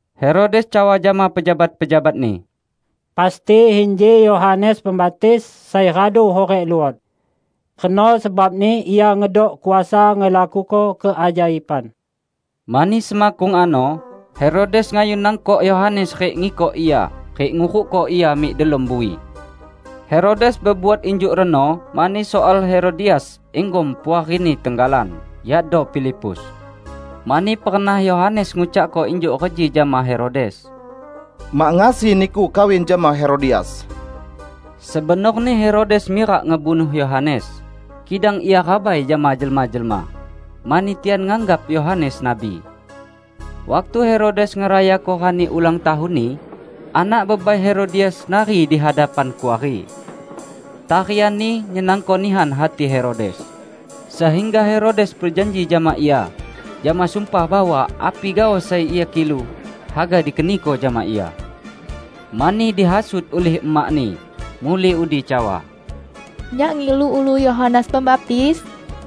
Herodes cawa jama pejabat-pejabatni, "Pasti inji Yohanes Pembaptis sai radu hurik luot! Reno sebabni Ia ngedok kuasa ngelakuko keajaiban." Mani semakkung ano Herodes ngayun nangkok Yohanes rik ngikok ia rik ngurukko ia mik delom bui. Herodes bebuat injuk reno mani soal Herodias, inggom puarini tenggalan, yakdo Filipus. Mani pernah Yohanes ngucakko injuk reji jama Herodes, "Mak ngasi niku kawin jama Herodias!" Sebenorni Herodes mirak ngebunuh Yohanes, kidang ia rabai jama jelma-jelma, mani tian nganggap Yohanes nabi. Waktu Herodes ngerayako rani ulang tahunni, anak bebai Herodias nari di hadapan kuari. Tarianni nyenangko nihan hati Herodes, sehingga Herodes bejanji jama ia jama sumpah bahwa api gaoh sai ia kilu, haga dikeniko jama ia. Mani dihasut ulih emakni, muli udi cawa, "Nyak ngilu ulu Yohanes Pembaptis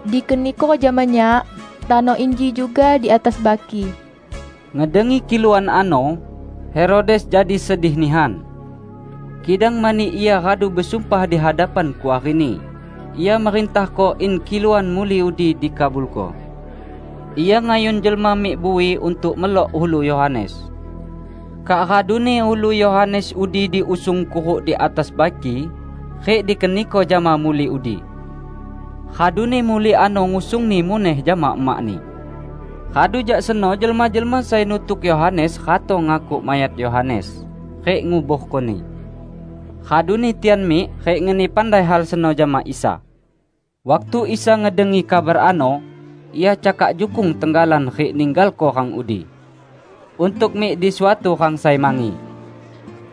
dikeniko jama nyak tano inji juga di atas baki!" Ngedengi kiluan ano, Herodes jadi sedih nihan. Kidang mani ia radu besumpah di hadapan kuarini, ia merintahko in kiluan muli udi dikabulko. Ia ngayun jelma mik bui untuk melok ulu Yohanes. Kak raduni ulu Yohanes udi diusung kuruk di atas baki rik dikeniko jama muli udi. Raduni muli ano ngusungni muneh jama emakni. Radu jak seno jelma-jelma sai nutuk Yohanes ratong ngakuk mayat Yohanes rik nguborkoni. Raduni tian mik rik ngeni pandai hal seno jama Isa. Waktu Isa ngedengi kabar ano, Ia cakak jukung tenggalan rik ninggalko rang udi, untuk mik di suatu rang sai mangi.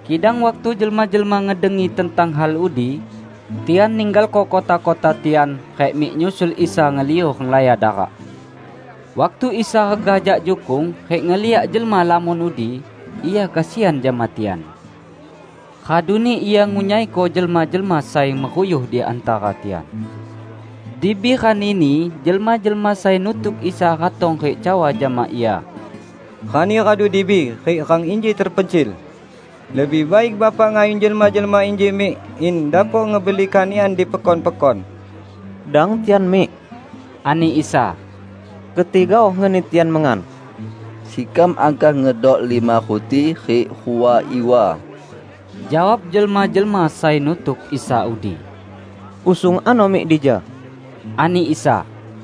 Kidang waktu jelma-jelma ngedengi tentang hal udi, tian ninggalko kota-kota tian rik mik nyusul Isa ngeliu renglaya darak. Waktu Isa regah jak jukung rik ngeliak jelma lamon udi, Ia kesian jama tian. Raduni Ia ngunyaiko jelma-jelma sai meruyuh di hantara tian. Dibi ranini, jelma-jelma sai nutuk Isa ratong rik cawa jama Ia, "Rani radu dibi rik rang inji tepencil. Lebih baik Bapak ngayun jelma-jelma inji mik, in dapok ngebeli kanikan di pekon-pekon." "Dang tian mik," ani Isa, "keti gaoh ngeni tian mengan." "Sekam angkah ngedok lima ruti rik rua iwa!" jawab jelma-jelma sai nutuk Isa udi. "Usung ano mik dija," ani Isa.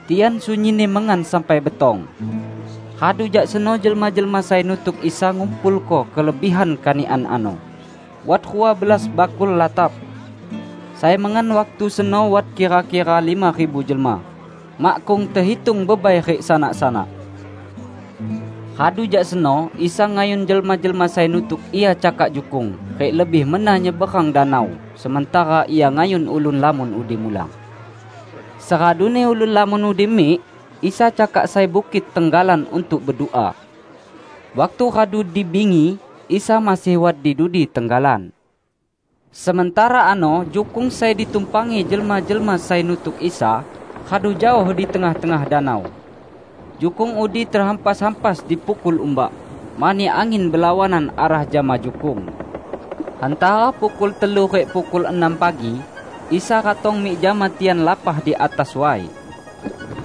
Tian sunyinni mengan sampai betong. Radu jak seno jelma-jelma sai nutuk Isa ngumpulko kelebihan kanikan ano; wat rua belas bakul latap. Sai mengan waktu seno wat kira-kira lima ribu jelma, makkung tehitung bebai rik sanak-sanak. Radu jak seno Isa ngayun jelma-jelma sai nutuk Ia cakak jukung rik lebih mena nyeberang danau, sementara Ia ngayun ulun lamon udi mulang. Seraduni ulun lamon udi mik, Isa cakak sai bukit tenggalan untuk bedua. Waktu radu di bingi, Isa masih wat di dudi tenggalan. Sementara ano jukung sai ditumpangi jelma-jelma sai nutuk Isa, radu jaoh di tengah-tengah danau. Jukung udi tehampas-hampas dipukul umbak, mani angin belawanan arah jama jukung. Hantara pukul telu rik pukul enam pagi, Isa ratong mik jama tian lapah di atas way.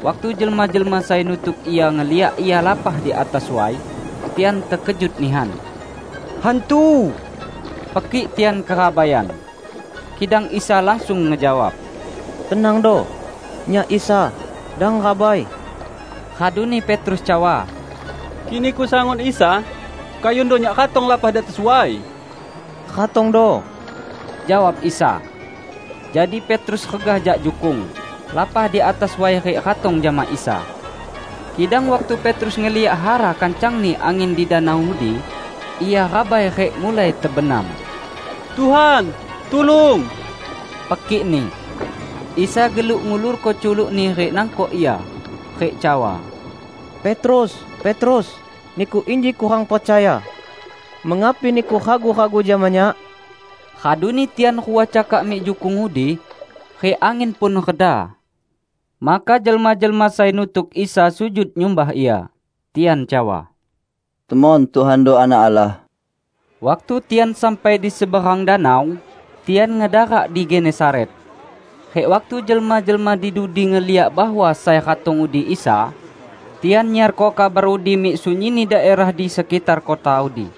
Waktu jelma-jelma sai nutuk Ia ngeliak Ia lapah di atas way, tian tekejut nihan. "Hantu!" pekik tian kerabaian. Kidang Isa langsung ngejawab, "Tenangdo! Nyak Isa. Dang rabai!" Raduni Petrus cawa, "Kik Niku sangun Isa, kayundo nyak ratong lapah di atas way." "Ratongdo," jawab Isa. Jadi Petrus regah jak jukung, lapah di atas way rik ratong jama Isa. Kidang waktu Petrus ngeliak hara kancangni angin di danau udi, ia rabai rik mulai tebenam. "Tuhan, tulung!" pekikni. Isa geluk ngulorko culuk-Ni rik nangkok ia, rik cawa, "Petrus, Petrus, niku inji kurang percaya. Mengapi niku ragu-ragu jama Nyak?" Raduni tian rua cakak mik jukung udi, rik angin pun reda. Maka jelma-jelma sai nutuk Isa sujud nyumbah Ia. Tian cawa, "Temon Tuhando Anak Allah!" Waktu tian sampai di seberang danau, tian ngedarak di Genesaret. Rik waktu jelma-jelma di dudi ngeliak bahwa sai ratong udi Isa, tian nyiarko kabar udi mik sunyinni daerah di sekitar kota udi.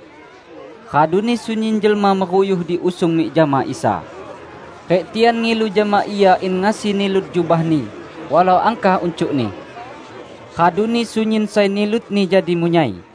Raduni sunyin jelma meruyuh diusung mik jama Isa. Rik tian ngilu jama Ia in ngasi nilut jubah-Ni, walau angkah uncukni. Raduni sunyin sai nilutni jadi munyai.